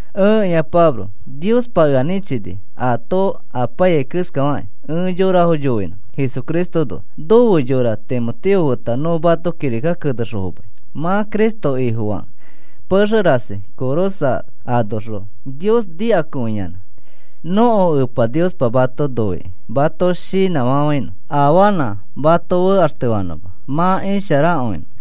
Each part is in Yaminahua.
Ẽkĩa Pablo, Niospa ea nĩchini, aato apaiyai keskafakĩ ẽ yorafo yoinõ Jesucristoõnoa. Nofe yora Timoteo feta nõ mato kirika kenexõ fomai. Mã Cristo Ifofakõikẽ, pexe rasi Colosas anoxõ Nios nikakõiyanã. Nõko Epa Niospa mato noikĩ mato shinãfafãinõ afanã mato fekaxtefanõma mã isharakõinõ.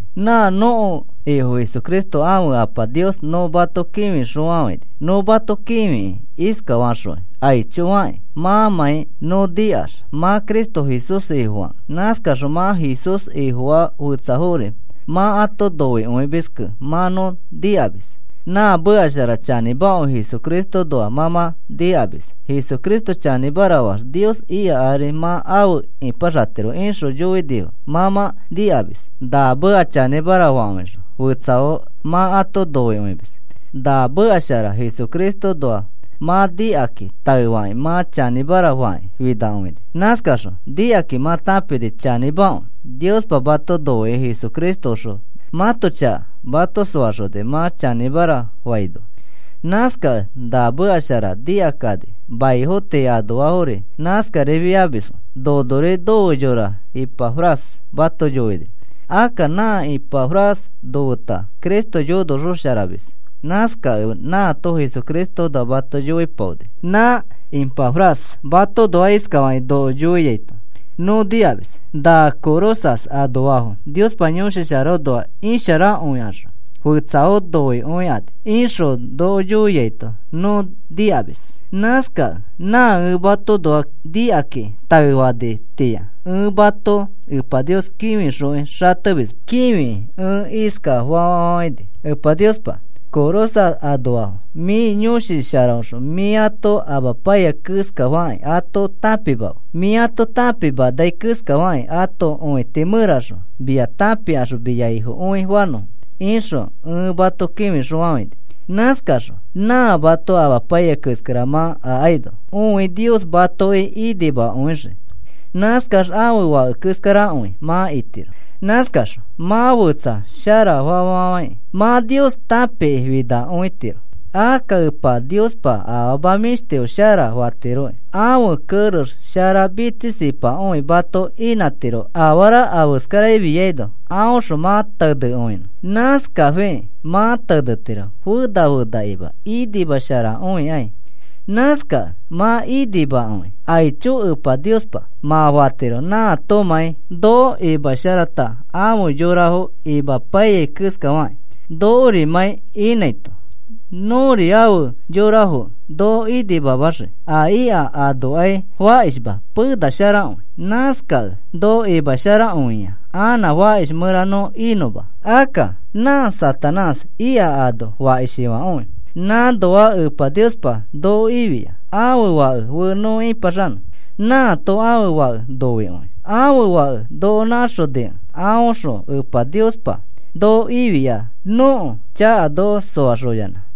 Nã nõko Ifo Jesucristo ãfe Apa Nios nõ mato kĩfixõfafãini. Nõ mato kĩfikĩ iskafaxokĩ aicho fakĩ mãmãi nõ nikax mã Cristo Jesús Ifofakõikẽ. Nãskaxõ nã Jesús Ifofaa fetsafori mã ato noikõimiskẽ mã nõ nikamis. Na meka shara chanĩmakõi Jesucristoõnoa mã mã nikamis. Jesucristo chanĩmara faax Nios ika ari mã afe ipaxatiro ixõ yoinifo mã mã nikamis. Na meka chanĩmara fakõixõ fetsafo mã ato noikõimis. Na meka shara Jesucristoõnoa mã nikakĩ taefakĩ mã chanĩmara fakĩ finakõini. Nãskaxõ nikakĩ mã tãpini chanĩmakõi, Niospa mato noikĩ Jesucristoõxõ mãto chaka mato soaxoni mã chanĩmara faino. Nãskakẽ na meka shara, nikakani maifo tii anoafori nãskarifiamisfo. Nonori nofe yora Ipafras mato yoini. Akka nã Ipafras nofeta Cristo yonosharaxomis, nãskakẽ nãato Jesucristoõnoa mato yoipaoni. Nã Ipafras matoõnoa iskafakĩ noko yoiaito nõ nikamis: “Na Colosas anoafo Niospa Yõshi Sharaõnoax isharakõikaxõ fetsafo noikõikani,” ixõ noko yoiaito nõ nikamis. Nãskakẽ nã ẽ matoõnoa nikakĩ taefanitĩa, ẽ mato Epa Nios kĩfixokĩ xatemisma. Kĩfikĩ ẽ iskafa fafafãini: “Epa Niospa, Colosas anoafo mĩ Yõshi Sharaõxõ mĩ ato amapaiyai keskafakĩ ato tãpimafe, mĩ ato tãpimanai keskafakĩ ãto õiti mẽraxõ mia tãpikaxõ mia Ifokõi fanõfo,” ixõ ẽ mato kĩfixõfafãini. Nãskaxõ nã mato amapaiyai keskara mã akaino õi Nios matoki inimakõixii. Nãskax ãfe Fake keskarakõi mã itiro. Nãskaxõ mã fetsafo sharafa fafafãikĩ mã Nios tãpiki finakõitiro. Akka Epa Niospa afama mĩshtifo shara fatiroki, ãfe kerex shara mitsisipakõi mato inãtiro afara afeskarafiaino aõxõ mã tenekõinõ. Nãskafikĩ mã tenetiro fena fenakĩma inimasharakõikai. Nãskakẽ mã inimakõi. “Aicho Epa Niospa,” mã fatiro nãatomãi noko imasharata afe yorafo inãpaiyai keskafakĩ nokorimãi inãito. Nõri afe yorafokẽ noko inimamaxii, a ika anokai fakishma penasharakõi. Nãskakẽ noko imasharakõia anã fakish mẽra nõ inõma. Akka nã Satanás ika ano fakishifãkõi. Nãnoa Epa Niospa noko ifia, ãfe Fake fe nõ ĩpaxanõ. Nãato ãfe Fake noikõi. Ãfe Fãke noko nãxonikẽ aõxõ Epa Niospa noko ifia, nõko chaka noko soaxoyanã.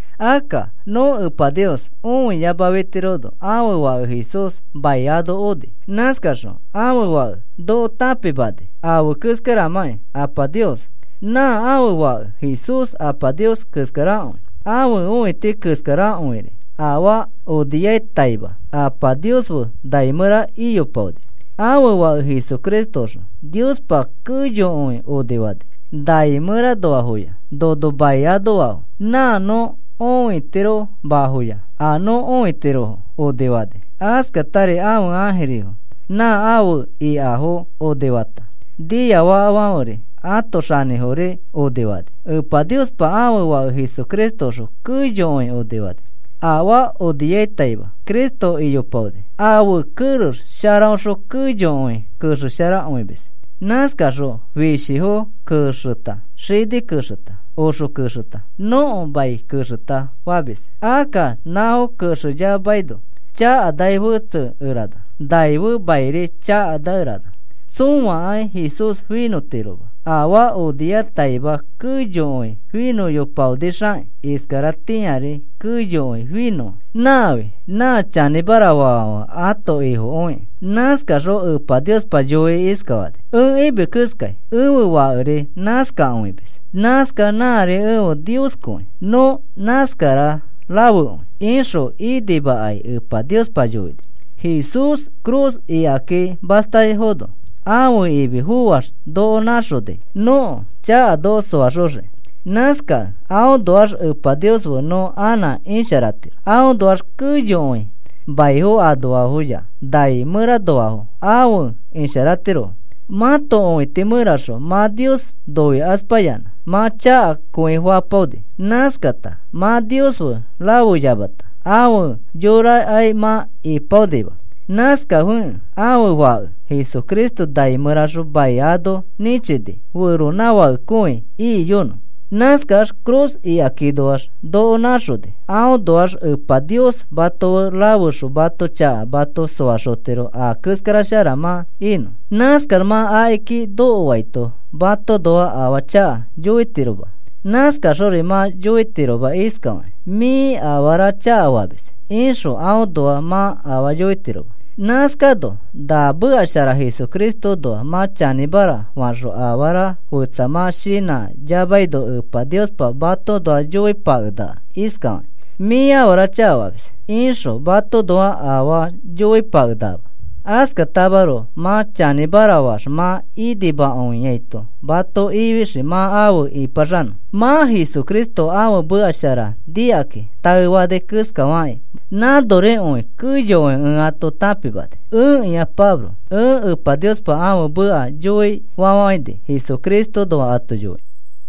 Akka nõ Epa Nios õiyamafitirono ãfe Fake Jesús mai ano oni. Nãskaxõ ãfe Fãke noko tãpimani afe keskaramãkĩ Apa Nios. Nã ãfe Fake Jesús Apa Nios keskarakõi, ãfe õiti keskarakõiri. Afaa oniataima Apa Nios fe nai mẽra iyopaoni. Ãfe Fake Jesucristoõxõ Niospa keyokõi onifani, nai mẽranoafoya nono mai anoafo. Nã nõ õitiromafoya, a nõ õitirofo onifani. Askatari ãfe ãjirifo nã afe ikafo onifata, niafakafãferi ãto xanĩfori onifani. Epa Niospa ãfe Fake Jesucristoõxõ keyokõi onifani. Afaa oniataima Cristo iyopaoni. Ãfe kerex sharaõxõ keyokõi kexesharakõimis. Nãskaxõ fishifo kexeta, xini kexeta, oxe kexeta, nõko mai kexeta famis. Akka nãfo kexeyamaino, chakanai fetsekerana. Nai fe mairi chakanakerana. Tsõakai Jesús finõtiroma, afaa oniataima keyokõi finõyopaonixakĩ, iskaratĩari keyokõi finõa. Nãfi nã chanĩmara faafãfe ãto Ifokõiki. Nãskaxõ Epa Niospa yoikĩ iskafani: “Ẽ imis keskai ẽfe Fakeri nãskakõimis, nãskax nãri efe Nioskõi, nõ nãskara rafekõi,” ixõ inimakai Epa Niospa yoini. Jesús ifi cruz ikaki mastaifono ãfe imi foax noko nãxoni nõko chaka noko soaxoxiki. Nãskakẽ aõnoax Epa Nios fe nõ anã isharatiro. Aõnoax keyokõi mai anoafoya nai mẽranoafo afe isharatirofo. Mãto õiti mẽraxõ mã Nios noikaspayanã, mã chakakõi fapaoni. Nãskata mã Nios fe rafeyamata, afe yorarikai mã ipaonima. Nãskafikẽ ãfe Fake Jesucristo nai mẽraxõ mai ano nĩchini feronãfakekõi ikiyonõ. Nãskax ifi cruz ikakinoax noko nãxoni, aõnoax Epa Nios mato fe rafexõ mãto chaka mato soaxotiro a keskara shara mã inõ. Nãskax mã akiki nokoaito matoõnoa afaa chaka yoitiroma. Nãskaxori mã yoitiroma iskafakĩ: “Mĩ afara chakafamis,” ixõ aõnoa mã afaa yoitiroma. Nãskano na meka shara Jesucristoõnoa mã chanĩmara faxõ afara fetsa mã shinãyamaino Epa Niospa matoõnoa yoipakenakama iskafakĩ: “Mĩ afara chakafamis,” ixõ matoõnoa afaa yoipakenakama. Askatamaroko mã chanĩmara faax mã inimakõiaito mato ifixii mã afe ĩpaxanõ. Mã Jesucristo ãfe meka shara nikakĩ taefani keskafakĩ nãnorikõi keyokõi ẽ ato tãpimani. Ẽkĩa Pablo, ẽ Epa Niospa ãfe meka yoifafãini Jesucristoõnoa ato yoikĩ.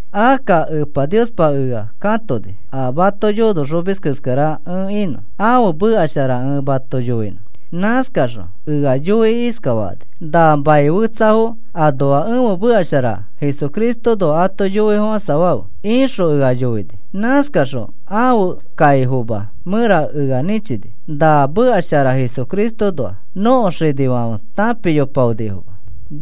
Akka Epa Niospa ea katoni, a mato yonoxomis keskara ẽ inõ, ãfe meka shara ẽ mato yoinõ. Nãskaxõ ea yoikĩ iskafani: “Na maniafo tii anoa ẽfe meka shara Jesucristoõnoa ato yoifofãsafafe,” ixõ ea yoini. Nãskaxõ ãfe kaifoma mẽra ea nĩchini. Na meka shara Jesucristoõnoa nõko xinifãfe tãpiyopaonifoma.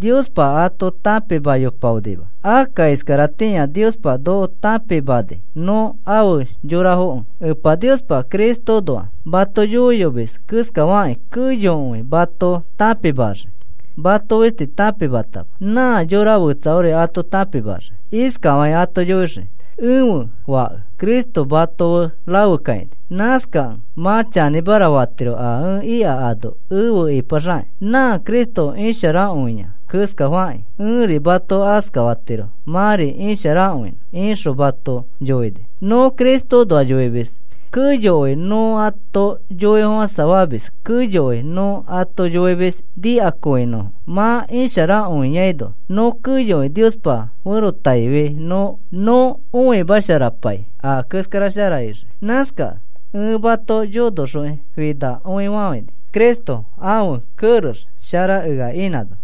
Niospa ato tãpimayopaonima. Akka iskaratĩa Niospa noko tãpimani nõ afe yorafokẽ. Epa Niospa Cristoõnoa mato yoiyomis keskafakĩ keyokõi mato tãpimaxii, mato fisti tãpimatama, nã yora fetsafori ato tãpimaxii. Iskafakĩ ato yoixii: “Ẽfe Fake Cristo mato fe rafekakãini, nãskakẽ mã chanĩmara fatiro a ẽ ika ano efe ipaxakĩ. Nã Cristo isharakõiai keskafakĩ ẽri mato askafatiro mãri isharakõinõ,” ixõ mato yoini. Nõ Cristoõnoa yoimis, keyokõi nõ ato yoifofãsafamis keyokõi nõ ato yoimis nikakõinõfo. Mã isharakõiano nõ keyokõi Niospa ferotaifi nõ õimasharapai a keskara shara ixii. Nãskakẽ ẽ mato yonoxokĩ finakõifafãini, Cristo ãfe kerex shara ea inãno.